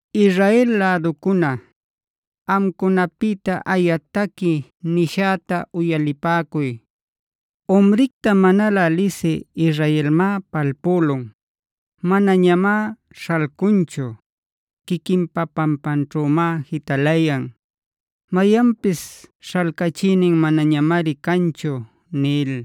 Israel läducuna, amcunapïta aya taqui nishäta uyalipäcuy: “Umricta manalä lisï Israelmá palpülun. Manañamá śhalcunchu; quiquinpa pampanćhümá jitalayan. Mayanpis śhalcachïnin manañamari canchu” nil.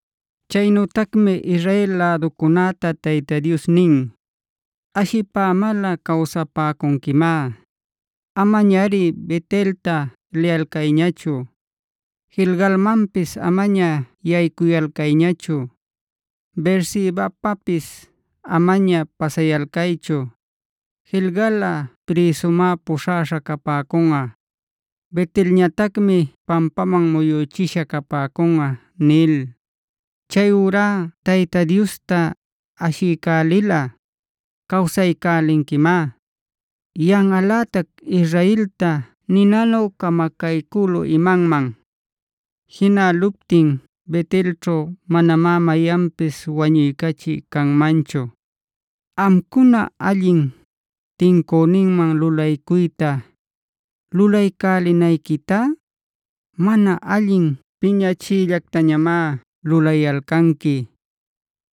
Chaynütacmi Israel läducunäta Tayta Dios nin: “Ashipämalꞌa cawsapäcunquimá. Amañari Bet-elta liyalcayñachu, Gilgalmanpis amaña yaycuyalcayñachu, Beersebapapisa amaña pasayalcaychu. Gilgalꞌa prïsumá puśhaśha capäcunꞌa. Bet-elñatacmi pampaman muyüchisha capäcunꞌa” nil. Chayurá Tayta Diosta ashiycälilꞌa cawsaycälinquimá. Yanꞌalätac Israelta ninanu camacaycülu imanman. Jinäluptin Bet-elćhu manamá mayanpis wañuycachï canmanchu. Amcuna, allin tincüninman lulaycuyta lulaycälinayquitá, mana allin piñachiyllactañamá lulayalcanqui.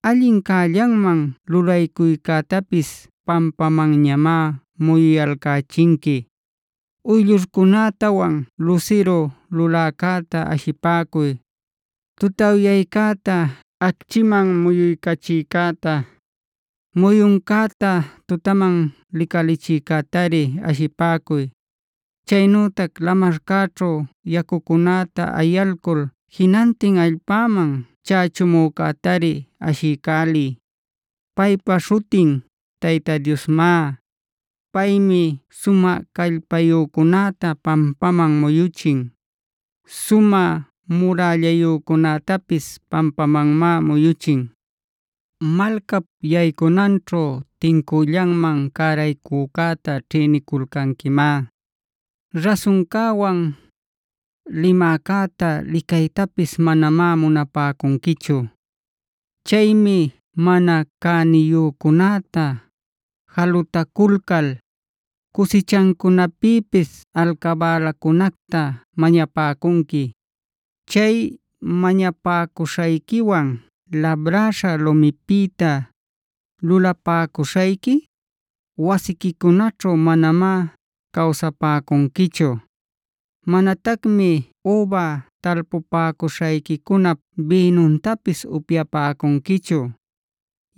Allin cällanman lulaycuycätapis pampamanñamá muyuyalcächinqui. Uyllurcunätawanb lusiru luläcäta ashipäcuy; tutawyaycäta acchiman muyuycachïcäta, muyuncäta tutaman licalichïcätari ashipäcuy; chaynütac lamarcäćhu yacucunäta ayalcul jinantin allpäman chächumücätari ashiycäliy. Paypa śhutin Tayta Diosmá. Paymi sumä callpayücunäta pampaman muyuchin; sumä murällayücunätapis pampamanmá muyuchin. Malcap yaycunanćhu tincüllanman cäraycücäta ćhïniculcanquimá. Rasuncäwan limäcäta licaytapis manamá munapäcunquichu. Chaymi mana cäniyücunäta jalutaculcal cusichancunapïpis alcabälacunacta mañapäcunqui. Chay mañapäcuśhayquiwan labräśha lumipïta lulapäcuśhayqui wasiquicunaćhu manamá cawsapäcunquichu. Manatacmi üba talpupäcuśhayquicunap bïnuntapis upyapäcunquichu.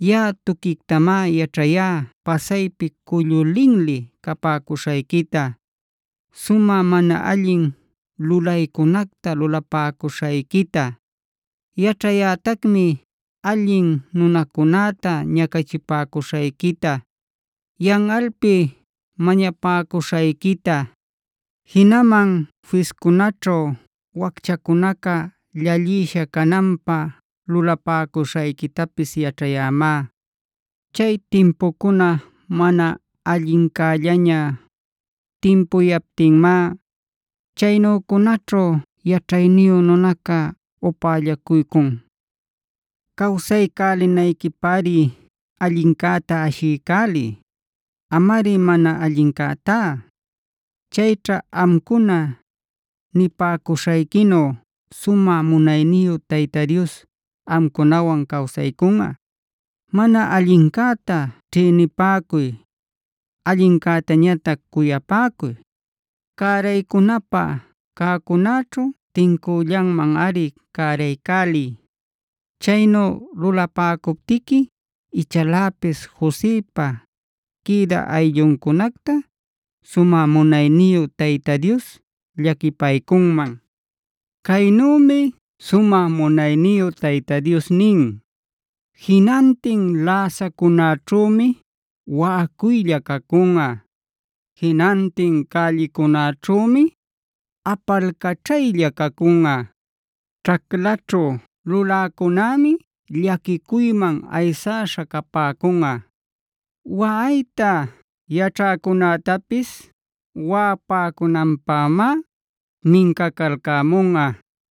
Yaꞌa tuquictamá yaćhayá pasaypi cullu linli capäcuśhayquita, sumä mana allin lulaycunacta lulapäcuśhayquita. Yaćhayätacmi allin nunacunäta ñacachipäcuśhayquita, yanꞌalpi mañapäcuśhayquita; jinaman fiscunäćhu wacchacunaca llallisha cananpä lulapäcuśhayquitapis yaćhayämá. Chay timpucuna mana allincällaña timpuyaptinmá, chaynücunaćhu yaćhayniyu nunacá upällacuycun. Cawsaycälinayquipäri allincäta ashiycäliy, amari mana allincätá. Chayćha amcuna nipäcuśhayquinu sumä munayniyu Tayta Dios amcunawan cawsaycunꞌa. Mana allincäta ćhïnipäcuy; allincätañatac cuyapäcuy. Cäraycunapä cäcunäćhu tincüllanmanꞌari cäraycäliy. Chaynu lulapäcuptiqui ichaläpis Josepa quïdä aylluncunacta sumä munayniyu Tayta Dios llaquipaycunman. Caynümi sumä munayniyu Tayta Dios nin: “Jinantin läsacunäćhümi waꞌacuylla cacunꞌa. Jinantin cällicunäćhümi apalcaćhaylla cacunꞌa. Ćhaclaćhu luläcunämi llaquicuyman ayaśha capäcunꞌa. Waꞌayta yaćhäcunätapis waꞌapäcunanpämá mincacalcämunꞌa.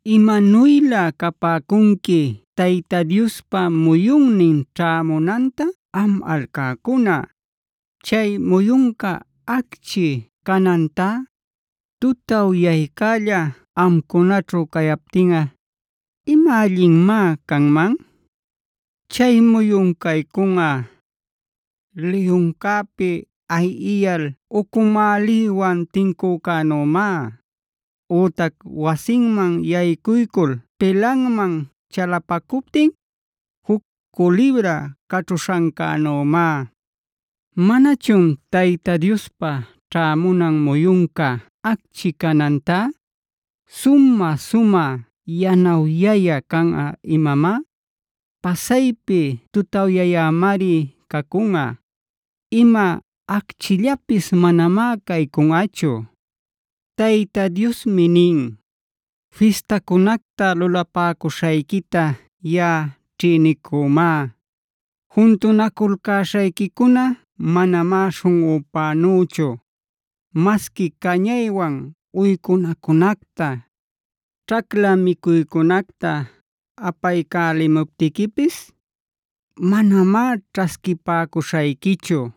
Imanuylä capäcunqui Tayta Diospa muyunnin ćhämunanta am alcäcuna. Chay muyunca acchi canantá, tutawyaycälla amcunaćhu cayaptinꞌa ¿ima allinmá canman? Chay muyun caycunꞌa, liyuncäpi ayiyal ucumäliwan tincücänümá, ütac wasinman yaycuycul pilanman chalapacuptin juc culibra caćhuśhancänümá. ¿Manachun Tayta Diospa ćhämunan muyunca acchi canantá, sumä-sumä yanawyayä canꞌa imamá? Pasaypi tutawyayämari cacunꞌa; ima acchillapis manamá caycunꞌachu. Tayta Diosmi nin: “Fistacunacta lulapäcuśhayquita yaꞌa ćhïnicümá. Juntunaculcäśhayquicuna manamá śhunꞌupänüchu. Masqui cañaywan uycunacunacta, ćhacla micuycunacta apaycälimuptiquipis manamá ćhasquipäcuśhayquićhu.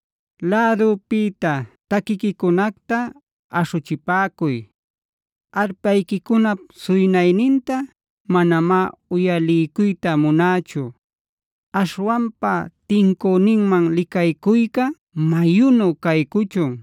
Lädüpïta taquiquicunacta aśhuchipäcuy. Arpayquicunap suynayninta manamá uyaliycuyta munächu. Aśhwanpa tincüninman licaycuyca mayunu caycuchun.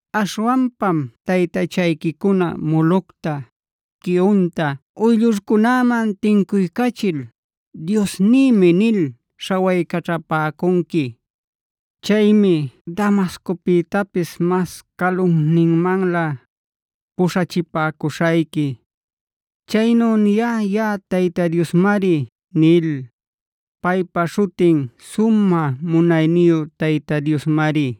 Aśhwanpam taytachayquicuna Molocta, Quiunta uyllurcunaman tincuycachil ‘diosnïmi’ nil śhawaycaćhapäcunqui. Chaymi Damascopïtapis mas calunninmanlä puśhachipäcuśhayqui. Chaynu niyá yaꞌa Tayta Diosmari” nil.e Paypa śhutin sumä munayniyu Tayta Diosmari.